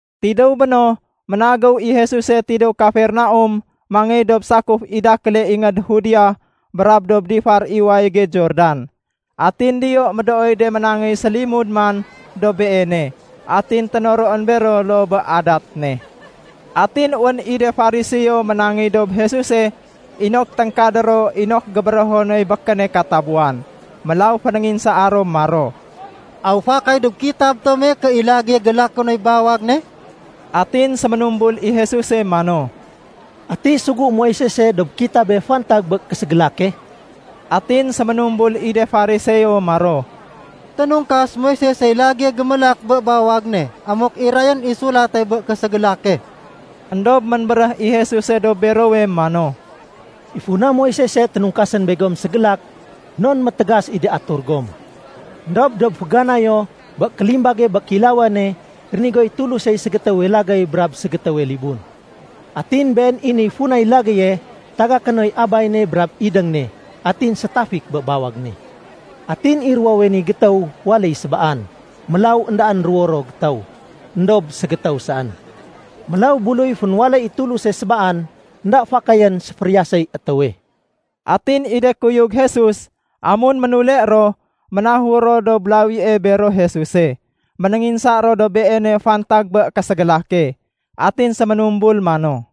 Tidéw béno, ménagéw i Jesuse tidéw Kafernaum mangéy dob sakuf i dakéle ingéd Judea brab dob difar i wayége Jordan. Atin diyo médooy de ménangéy sélimud man dob Beene. Atin ténoroén bero loo bé adat ne. Atin wén i de Fariseo ménangéy dob Jesuse inok téngkadé ro inok gébérého noy békéne katabuwan. Mélaw fénénginsaa ro maro, “Aw fakay dob kitab tome ké i lagéye gélaké noy bawag ne?” Atin séménumbul i Jesuse mano, “Ati sugu Moisese dob kitabe fantag bé késégélake?” Atin séménumbul i de Fariseo maro, “Ténungkas Moisesey lagéye gémélak bé bawag ne amuk irayén i sulate bé késégélake.” Endob ménbéréh i Jesuse dob berowe mano, “I funa Moisese ténungkasén begom ségélak non métégas i de atur gom. Endob dob féganayo bé kélimbage bé kéilawane, rénigoy Tulusey ségétéwe lagéy brab ségétéwe libun. Atin been i niy funay lagéye tagaké noy abay ne brab idéng ne atin sétafik bé bawag ne. Atin i ruwowe ni gétéw waléy sébaan. Mélaw éndaén ruwo ro gétéw, éndob ségétéw saén. Mélaw buluy fénwaléy i Tuluse sébaan, énda fakayén séfériyaséy étéwe.” Atin i de kuyug Jesus, amun ménule ro ménahur ro dob lawie bero Jesuse, ménénginsa ro dob Beene fantag bé késégélake. Atin séménumbul mano,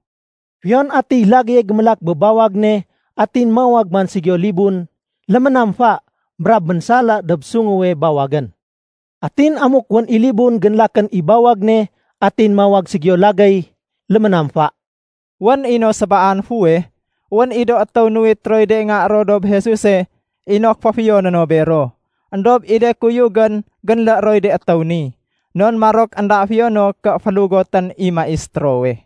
“Fiyon atiy lagéye gémélak bé bawag ne atin mawag man ségiyo libun, léménamfa, brab ménsala dob sunguwe bawagén. Atin amuk wén i libun génlakén i bawag ne atin mawag ségiyo lagéy, léménamfa.” Wén i no sébaan fuweh, wén i do étéw nuwit roy de nga ro dob Jesuse inok féfiyoné no bero. Endob i de kuyugén génlé roy de étéw ni, non marok énda fiyo no ké félugotén i Maistérowe.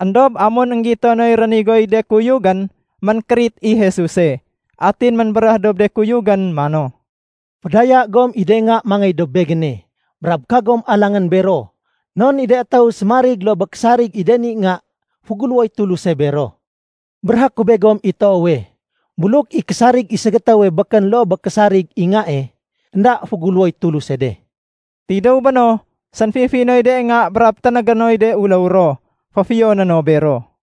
Endob amun énggito noy rénigoy de kuyugén, ménkérit i Jesuse. Atin ménbéréh dob de kuyugén mano, “Fédaya gom i de nga mangéy dob Begéne. Brab kagom alangén bero non i de étéw sémarig loo bé késarig i de ni nga, féguléwoy Tuluse bero. Béréhé ku begom i toowe, buluk i késarig i ségétéwe békén loo bé késarig i ngae, énda féguléwoy Tuluse de.” Tidéw béno, sénfifi noy de nga brab ténégé noy de uléw ro féfiyoné no bero.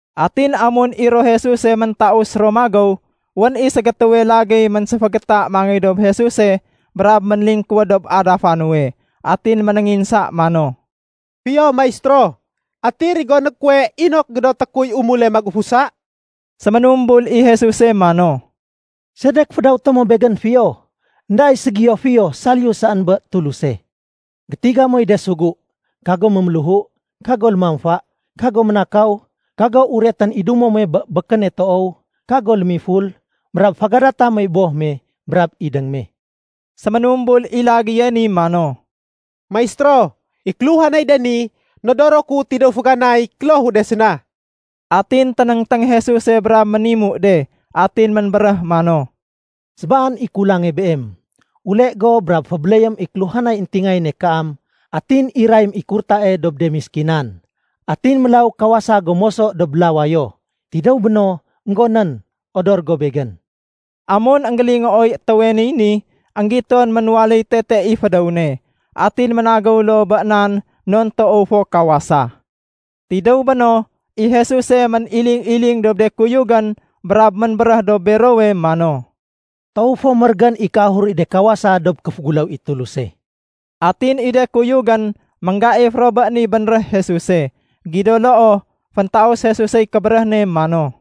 Atin amun i ro Jesuse méntaus ro magéw, wén i ségétéwe lagéy ménséfégéta mangéy dob Jesuse brab ménlingkuwéd dob adafa nuwe. Atin ménénginsa mano, “Fiyo Maistéro, ati rigoné kuwe inok gédoté kuy umule magufusa?” Séménumbul i Jesuse mano, “Sedek fédawété mo Begén fiyo? Enda i ségiyo fiyo saliyu saén bé Tuluse. Gétiga moy de sugu. Kago méméléhu, kago lémamfa, kago ménakaw, kago uretén i dumo muwe bé békéne toow, kago lémiful, brab fégadata moy boh me brab idéng me.” Séménumbul i lagéye ni mano, “Maistéro, i kéluhanay de ni nodoro ku tidéw féganay klohu de séna.” Atin ténéngténg Jesuse brab ménimu de. Atin ménbéréh mano, “Sébaan i kulange beem. Ule go brab fébéléyém i kéluhanay éntingayéne kaam atin irayém i kurtae dob de méskinan. Atin mélaw kawasa go moso dob lawayo. Tidéw béno, énggonén, odor go Begén.” Amun énggélingooy étéwe niy ni, énggiton ménwaléy tete i fédéw ne. Atin ménagéw loo bé nan, non toow fo kawasa. Tidéw béno, i Jesuse méniling-iling dob de kuyugén brab ménbéréh dob berowe mano, “Toow fo mérégén i kéahur i de kawasa dob kéféguléw i Tuluse.” Atin i de kuyugén ménggaif ro bé ni bénréh Jesuse. Gido loo, féntaus Jesusey kébéréh ne mano,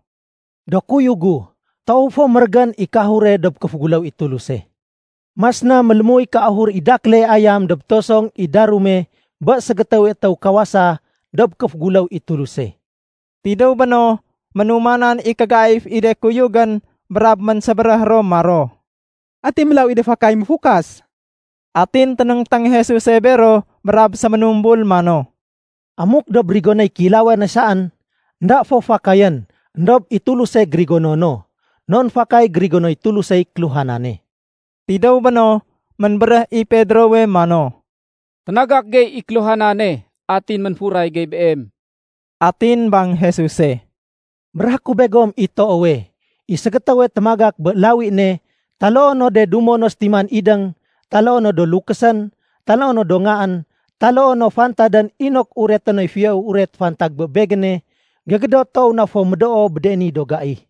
“Do kuyug gu, toow fo mérégén i kéahure dob kéféguléw i Tuluse. Mas na mélémuy kéahur i dakéle ayam dob tosong i darume bé ségétéwe étéw kawasa dob kéféguléw i Tuluse.” Tidéw béno, ménumanan i kégaif i de kuyugén brab ménsébéréh ro maro, “Ati mélaw i de fakay méfukas?” Atin ténéngténg Jesuse bero brab séménumbul mano, “Amuk dob rigonéy kéilawane saén, énda fo fakayén. Endob i Tuluse gérigono no, non fakay gérigonoy Tulusey kéluhanane.” Tidéw béno, ménbéréh i Pedrowe mano, “Ténagak gey i kéluhanane atin ménfuray gey Beem.” Atin bang Jesuse, “Béréhé ku begom i toowe, i ségétéwe témagak bé lawi ne, taloo no de dumo no sétiman idéng, taloo no do lukésén, taloo no do ngaén, taloo no fantadén inok ureté noy Fiyowe Uret fantag bé Begéne, gégédot toow na fo médoo bé de ni do gai.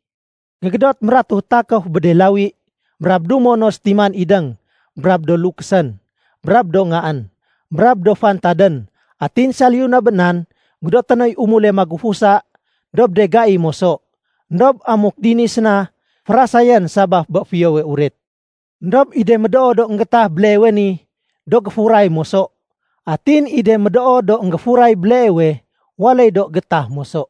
Gégédot mératuh takéf bé de lawi, brab dumo no sétiman idéng, brab do lukésén, brab do ngaén, brab do fantadén. Atin saliyu na bé nan, gédoté noy umule magufusa dob de gai moso. Endob amuk dini séna, férasayén sabaf bé Fiyowe Uret. Endob i de médoo do énggéétah béleewe ni, do géfuray moso. Atin i de médoo do énggéfuray béleewe, waléy do géétah moso.”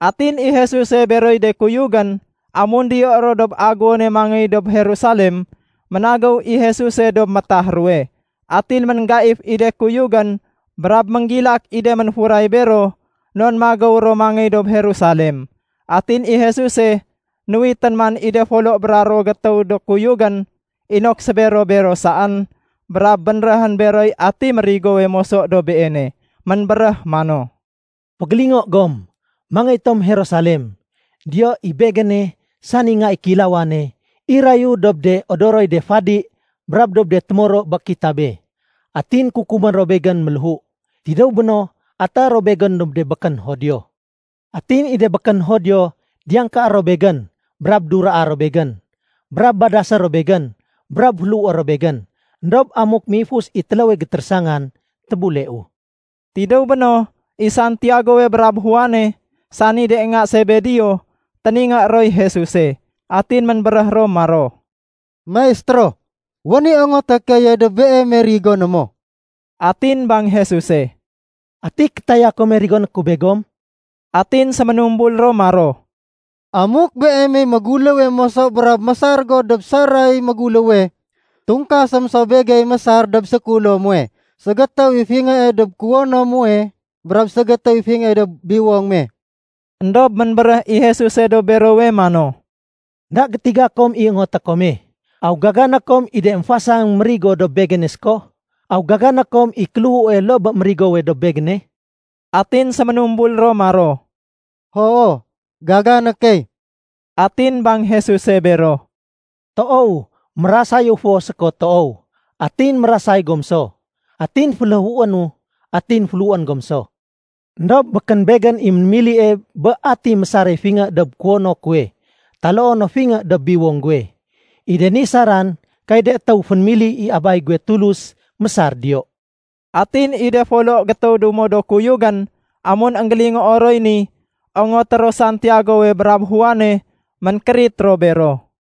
Atin i Jesuse beroy de kuyugén, amun diyo ro dob aguwone mangéy dob Jerusalem, ménagéw i Jesuse dob métah ruwe. Atin ménggaif i de kuyugén brab ménggilak i de ménfuray bero, non magéw ro mangéy dob Jerusalem. Atin i Jesuse nuwitén man i de folo bra ruwo gétéw do kuyugén, inok sébero-bero saén, brab bénréhén beroy ati mérigowe moso dob Beene. Ménbéréh mano, “Fégélingo gom, mangéy tom Jerusalem. Diyo, i Begéne, sani Nga i Kéilawane, irayu dob de odoroy de fadi brab dob de témoro bé kitabe. Atin kukumé ro Begén méléhu. Tidéw béno, atéé ro Begén dob de békén Judio. Atin i de békén Judio, diyangkaé ro Begén, brab duraa ro Begén, brab badasé ro Begén, brab féléhué ro Begén. Endob amuk méifus i téléwe gétérésangan, tébuleu.” Tidéw béno, i Santiagowe brab Juane, sani de nga Sebedeo, téningé roy Jesuse. Atin ménbéréh ro maro, “Maistéro, wén i ongoté keye dob Beeme rigoné mo.” Atin bang Jesuse, “Ati kétaya kome rigoné ku begom?” Atin séménumbul ro maro, “Amuk Beem i méguléwe moso brab mésar go dob saray méguléwe, tungkasém so begey mésar dob sékulo muwe ségétéw i fingée dob kuwono muwe brab ségétéw i fingée dob biwong me.” Endob ménbéréh i Jesuse dob berowe mano, “Enda gétiga kom i ongoté kome. Aw gagané kom i de émfasang mérigo dob Begéne séko? Aw gagané kom i kéléhue loo bé mérigowe dob Begéne?” Atin séménumbul ro maro, “Hoo, gagané key.” Atin bang Jesuse bero, “Toow, mérasayu fo séko toow, atin mérasay gom so. Atin féléhuénu, atin féléhuén gom so. Endob békén Begén i mémilie bé ati mésare fingé dob kuwono kuwe taloo no fingé dob biwong guwe. I de ni saran kay de étéw fénémili i Abay guwe Tulus mésar diyo.” Atin i de folo gétéw dumo do kuyugén, amun énggélingoo roy ni ongoté ro Santiagowe brab Juane, ménkérit ro bero.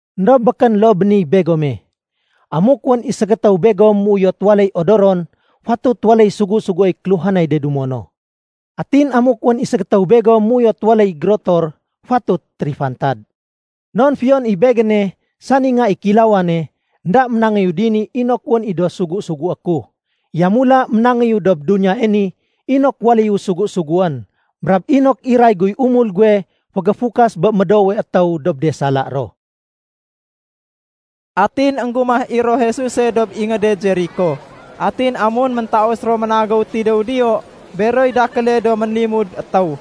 Endob békén loo bé niy begome. Amuk wén i ségétéw begom méuyot waléy odoron, fatut waléy sugu-suguéy kéluhanay de dumo no. Atin amuk wén i ségétéw begom méuyot waléy gérotor, fatut térifantad. Non fiyon i Begéne sani Nga i Kéilawane, énda ménangéyu dini inok wén i do sugu-sugué ku. Yamula ménangéyu dob duniyae ni inok waléyu sugu-suguén brab inok iray guy umul guwe fégéfukas bé médoowe étéw dob de sala ro.” Atin énggumah i ro Jesuse dob ingéde Jeriko. Atin amun méntaus ro ménagéw tidéw diyo beroy dakéle do ménlimud étéw,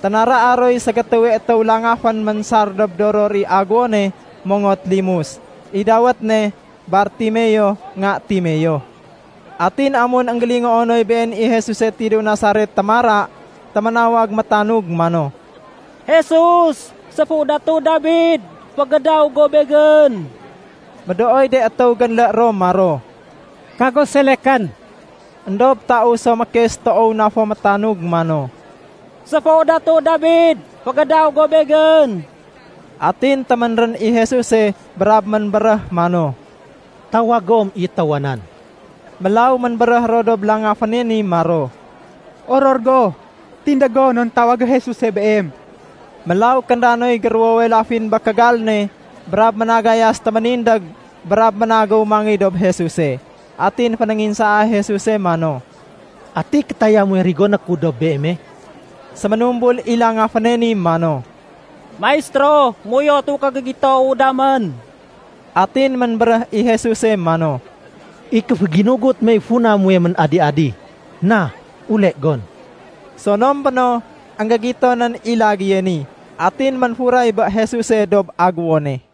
ténaraa roy ségétéwe étéw langafén ménsar dob doror i aguwone mongot limus. I dawét ne Bartimeo, nga Timeo. Atin amun énggélingoo noy Been i Jesuse tidéw Nasaret témara, téménawag métanug mano, “Jesus, séfu Datu Dabid, fégédaw go begén!” Médooy de étéw génlé ro maro, “Kago selekén!” Endob taus so mékes toow na fo métanug mano, “Séfu Datu Dabid, fégédaw go begén!” Atin téménrén i Jesuse brab ménbéréh mano, “Tawag gom i étéwa nan.” Mélaw ménbéréh ro dob langaféne ni maro, “Oror go! Tindég go non tawagé Jesuse beem.” Mélaw kénda noy géruwowe lafin bé kégal ne brab ménagayas téménindég brab ménagéw mangéy dob Jesuse. Atin fénénginsaa Jesuse mano, “Ati kétaya muwe rigoné ku dob beeme?” Séménumbul i langaféne ni mano, “Maistéro, méuyotu ké gégitowu damén.” Atin ménbéréh i Jesus mano, “I kéféginugut mey funa muwe ménadi-adi. Na, ule gon.” Sonom béno, énggégito nén i lagéye ni, atin ménfuray bé Jesuse dob aguwone.